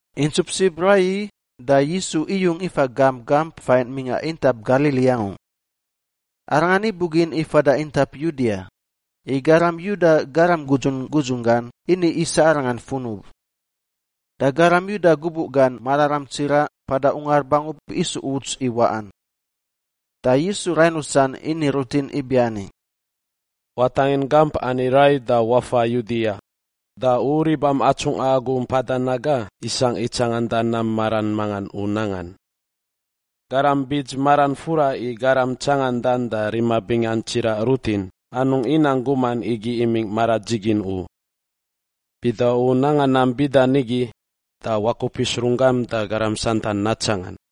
Intsup sib raiyi da Yisu iyung ifa gamp gamp fain mingꞌa intap Galili angu. Arangan ibugin i fada intap Yudia, i garam Yuda garam gudzun gudzun gan ini isa Arangan funub. Da garam Yuda gubuꞌ gan mararam tsiraꞌ Mpada Ungar Bangub isu uts i waꞌan. Da Yisu rain rusan ini rutin ibiani, “Watangin gamp ani rai da wafa Yudia, da u ribam atsungꞌa agu mpada naga isangꞌ i tsanganda nam maran mangan u nangan. Garam bits maran fura i garam tsangandan da rima bingan tsiraꞌ rutin anungꞌ inang guman igi imingꞌ mara dzigin u. Bida u nanga nam bida nigi, da wakupis runggam da garam santan natsangan.”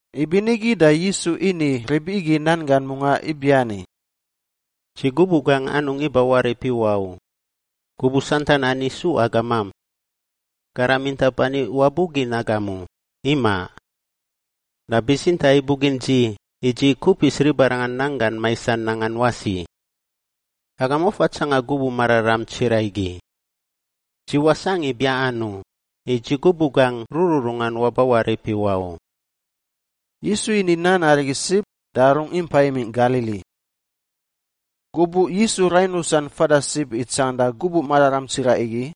Ibinigi da Yisu ini rib igi nan gan mungaꞌ ibiani, “Dzi gubuꞌ gangꞌ anungꞌ iba warip iwaꞌ u. Gubuꞌ santan ani isu agamam. Garam intap ani wabugin agam u, imaꞌ! Da bitsintaꞌ ibugin dzi i dzi kupis ribarangan nanggan maisan nangan wasi. Agam wafa tsanga gubuꞌ mararam tsiraꞌ igi. Dzi wasangꞌ i biaꞌan u, i dzi gubuꞌ gangꞌ rururungan waba warip iwaꞌ u.” Yisu ini nan arigi sib da rungꞌ impa imingꞌ Galili. Gubuꞌ Yisu rain rusan fada sib i tsanganda gubuꞌ mararam tsiraꞌ igi,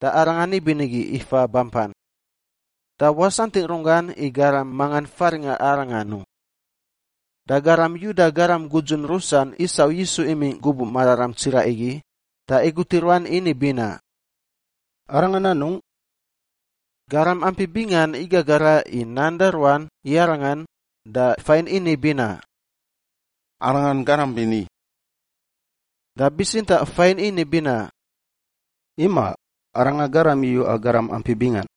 da Arangan ibinigi ifa bampan. Da wasantingꞌ runggan i garam mangan faringꞌa Arangan u. Da garam Yuda garam gudzun rusan isau Yisu imingꞌ gubuꞌ mararam tsiraꞌ igi da igut i ruan ini binaꞌ, “Arangan anungꞌ?” Garam ampi bingan igagara i nan da ruan i Arangan, da fain ini binaꞌ, “Arangan garam bini.” Da bitsintaꞌ fain ini binaꞌ, “Imaꞌ, arangan garam iyuꞌa garam ampi bingan.”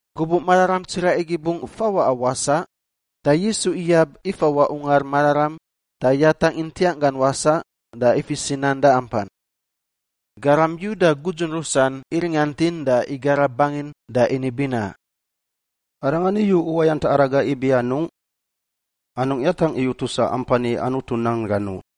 Gubuꞌ mararam tsiraꞌ igi bungꞌ fawaꞌa wasaꞌ, da Yisu iyab ifawaꞌ Ungar Mararam da yatangꞌ i ntiangꞌ gan wasaꞌ da ifis i nan da ampan. Garam Yuda gudzun rusan iringantin da igara bangin da ini binaꞌ, “Arangan iyu uwayant araga ibi anungꞌ? Anungꞌ yatangꞌ i utusa ampan i Anutu nan gan u!”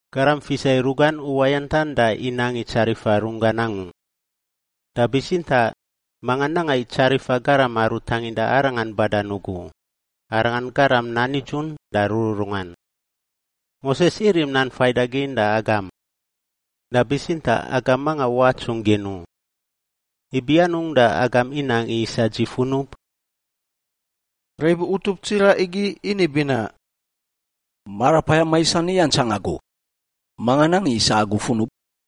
Garam fisa i rugan uwayantan da inang i tsarifa runggan angu. Da bitsintaꞌ manga nanga i tsarifa garam aru tanginda arangan badan ugu, arangan garam nan nidzun da rururungan. Moses irim nan faidagin da agam. Da bitsintaꞌ agam manga watsungꞌ gin u. Ibi anungꞌ da agam inang i isa dzi funub?” Rib utup tsiraꞌ igi ini binaꞌ, “Marapayam maisan iyantsang agu! Manga nang i isa agu funub?”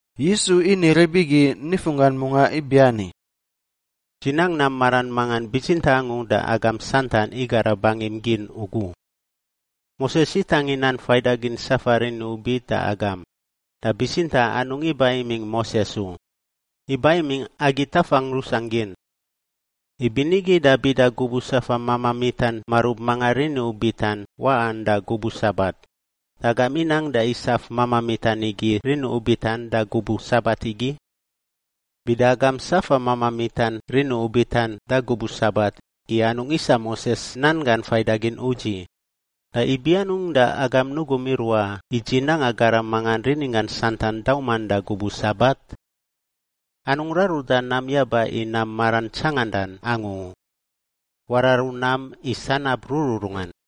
Yisu ini rib igi nifunggan mungaꞌ ibiani, “Dzi nang nam maran mangan bitsintaꞌ angu da agam santan igara bangim gin ugu. Moses itangin nan faidagin safa rini ubit da agam (da bitsintaꞌ anungꞌ iba imingꞌ Moses u — iba imingꞌ agi tafangꞌ rusangꞌ gin). Ibinigi da bida gubuꞌ safa mamaꞌ mitan marub mangan rini ubitan waꞌan da gubuꞌ Sabat, da agam inang da isaf mamaꞌ mitan igi rini ubitan da gubuꞌ Sabat igi. Bida agam safa mamaꞌ mitan rini ubitan da gubuꞌ Sabat i anungꞌ isa Moses nan gan faidagin udziꞌ, da ibi anungꞌ da agam nugum iruaꞌ i dzi nanga garam mangan rininggan santan dauman da gubuꞌ Sabat? Anungꞌ raruda nam yaba i nam maran tsangandan angu u; wararu nam i sanab rururungan.”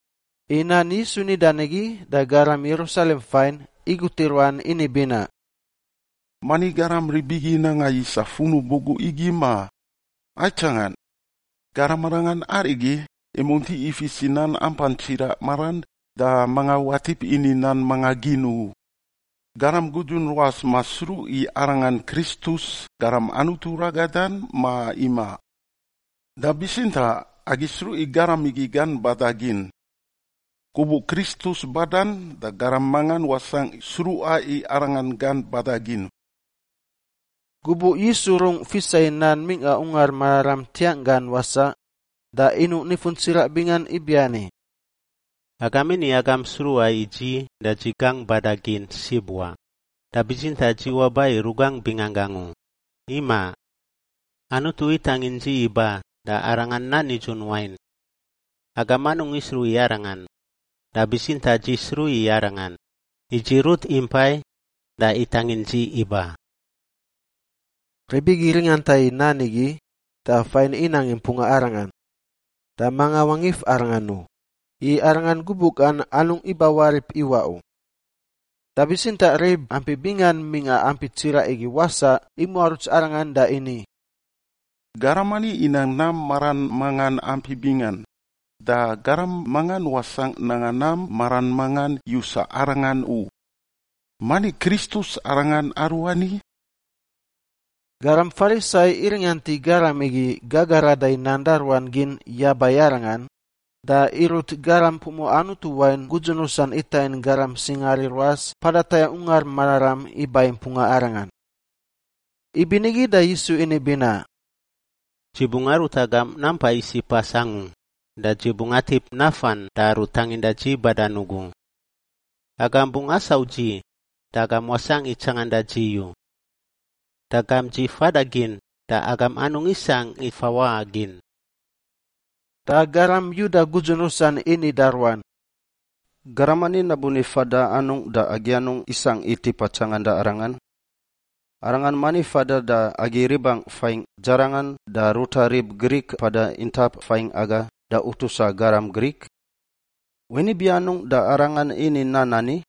I nan Yisu nidan igi da garam Yerusalem fain igut i ruan ini binaꞌ, “Mani garam rib igi nanga i isa funub ugu igi, ma? Aitsangan! Garam arangan arigi, imunti ifis i nan ampan tsiraꞌ maran da manga watip ini nan manga gin u. Garam gudzun ruas masruꞌ i arangan Kristus, Garam Anutu ragadan, ma imaꞌ? Da bitsintaꞌ agi sruꞌ i garam igi gan bada gin. Gubuꞌ Kristus badan da garam mangan wasangꞌ sruꞌa i arangan gan bada gin.” Gubuꞌ Yisu rungꞌ fisa i nan mingꞌa Ungar Mararam ntiangꞌ gan wasaꞌ da inuꞌ nifun tsiraꞌ bingan ibiani, “Agam ini agam sruꞌa i dzi da dzi gangꞌ bada gin sib wa, da bitsintaꞌ dzi waba i rugangꞌ binganggangꞌ u, imaꞌ! Anutu itangin dzi iba, da Arangan nan nidzun wain. Agam anungꞌ isruꞌ i Arangan, da bitsintaꞌ dzi sruꞌ i Arangan, i dzi rut impai da itangin dzi iba.” Rib igi ringanta i nan igi, da fain inang i mpunga Arangan, da manga wangif Arangan u, i Arangan gubuꞌ gan anungꞌ ibawarip iwaꞌ u. Da bitsintaꞌ rib ampi bingan mingꞌa ampi tsiraꞌ igi wasaꞌ imuaruts Arangan da ini, “Garam ani inang nam maran mangan ampi bingan, da garam mangan wasangꞌ nanga nam maran mangan yusa arangan u. Mani Kristus arangan aruani?” Garam Farisai iringant i garam igi gagarada i nan da ruan gin yaba i Arangan, da irut garam pumuꞌa Anutu wain gudzun rusan itangin garam singaari ruas mpada tayangꞌ Ungar Mararam iba i mpunga Arangan. Ibinigi da Yisu ini binaꞌ, “Dzi bungꞌ arut agam nampa isiꞌ pas angu da dzi bungꞌ atip nafan da Aru tanginda dzi badan ugu. Agam bungꞌ asau dzi, da agam wasangꞌ i tsanganda dzi u. Da gamp dzi fada gin, da agam anungꞌ isangꞌ i fawaꞌa gin.” Da garam Yuda gudzun rusan ini da ruan, “Garam ani nabuni fada anungꞌ da agi anungꞌ isangꞌ i tipa tsanganda arangan? Arangan mani fadan da agi ribangꞌ fain dzarangan da ruta rib Grik mpada intap faingꞌ aga da utusa garam Grik? Wain ibi anungꞌ da arangan ini nan ani,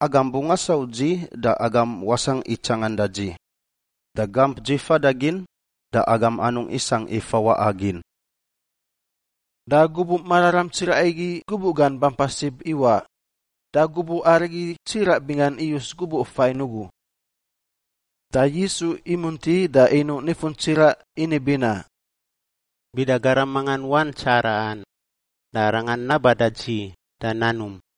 ‘Agam bungꞌ asau dzi, da agam wasangꞌ i tsanganda dzi,’ da ‘Gamp dzi fada gin, da agam anungꞌ isangꞌ i fawaꞌa gin’?” Da gubuꞌ mararam tsiraꞌ igi gubuꞌ gan bampa sib iwaꞌ, da gubuꞌ arigi tsiraꞌ bingan iyus gubuꞌ fain ugu. Da Yisu imunti da inuꞌ nifun tsiraꞌ ini binaꞌ, “Bida garam mangan wan tsaraꞌan, da arangan naba da dzi da nanum.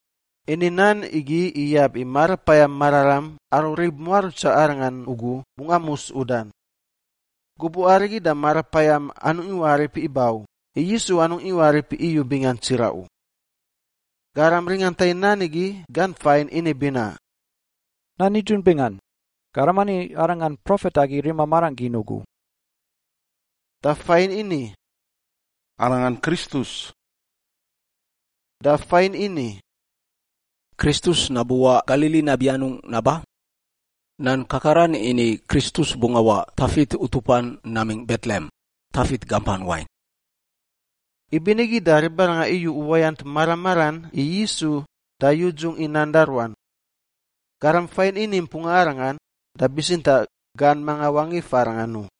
Ini nan igi iyab i Marapayam Mararam aru rib muarutsa Arangan ugu bungꞌ amus udan. Gubuꞌ arigi da Marapayam anungꞌ iwarip iba u, i Yisu anungꞌ iwarip iyu bingan tsiraꞌ u. Garam ringanta i nan igi gan fain ini binaꞌ, “Nan nidzun bingan, garam ani arangan Profet agi rima marangꞌ gin ugu.” Da fain ini, “Arangan Kristus.” Da fain ini, “Kristus nabuwaꞌ Galili nabi anungꞌ naba? Nan Kakaran ini i Kristus bungꞌ awaꞌ Tafit utupan namingꞌ Betlehem, Tafit gampan wain.” Ibinigi da ribaranga iyu uwayant mara maran i Yisu da yudzungꞌ i nan da ruan. Garam fain ini i mpunga Arangan, da bitsintaꞌ gan manga wangif Arangan u.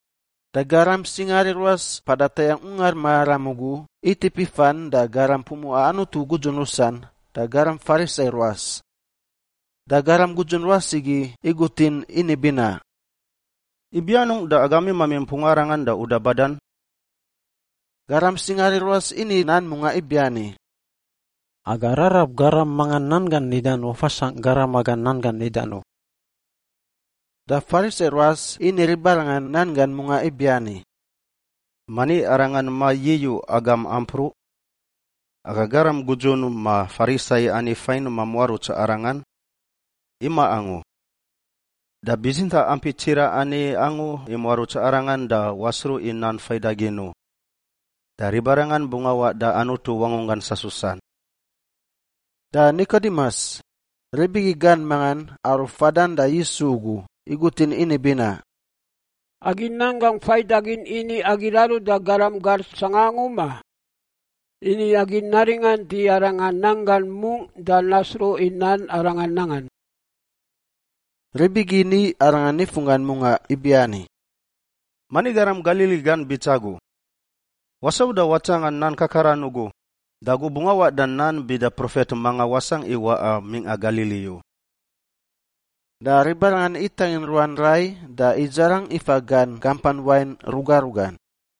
Da garam singaari ruas mpada tayangꞌ Ungar Mararam ugu itip ifan da garam pumuꞌa Anutu gudzun rusan da garam Farisai ruas. Da garam gudzun ruas igi igutin ini binaꞌ, “Ibi anungꞌ da agam imami mpunga arangan da uda badan?” Garam singaari ruas ini nan mungaꞌ ibiani, “Aga rarab garam mangan nan gan nidan wafasangꞌ garam aga nan gan nidan u.” Da Farisai ruas ini ribarangan nan gan mungaꞌ ibiani, “Mani arangan ma-yiyuꞌ agam ampruꞌ? Aga garam gudzun ma Farisai ani fain mamuaruts arangan? Imaꞌ angu! Da bitsintaꞌ ampi tsiraꞌ ani angu imuaruts arangan da wasruꞌ i nan faidagin u. Da ribarangan bungꞌ awaꞌ da Anutu wangunggan sasusan.” Da Nikodimus, rib igi gan mangan aru fadan da Yisu ugu, igutin ini binaꞌ, “Agi nan gangꞌ faidagin ini agi raruda garam gar sanga angu, ma? Ini agi naringant i arangan nan gan mungꞌ da nasruꞌ i nam arangan nangan.” Rib igi ini arangan nifunggan mungaꞌ ibiani, “Mani garam Galili gan bits agu? Wasau da watsangan nan kakaran ugu, da agu bungꞌ awaꞌ da nan bida profet manga wasangꞌ i waꞌa mingꞌa Galili u!” Da ribarangan itangin ruan rai da idzarang ifa gan gampan wain ruga rugan.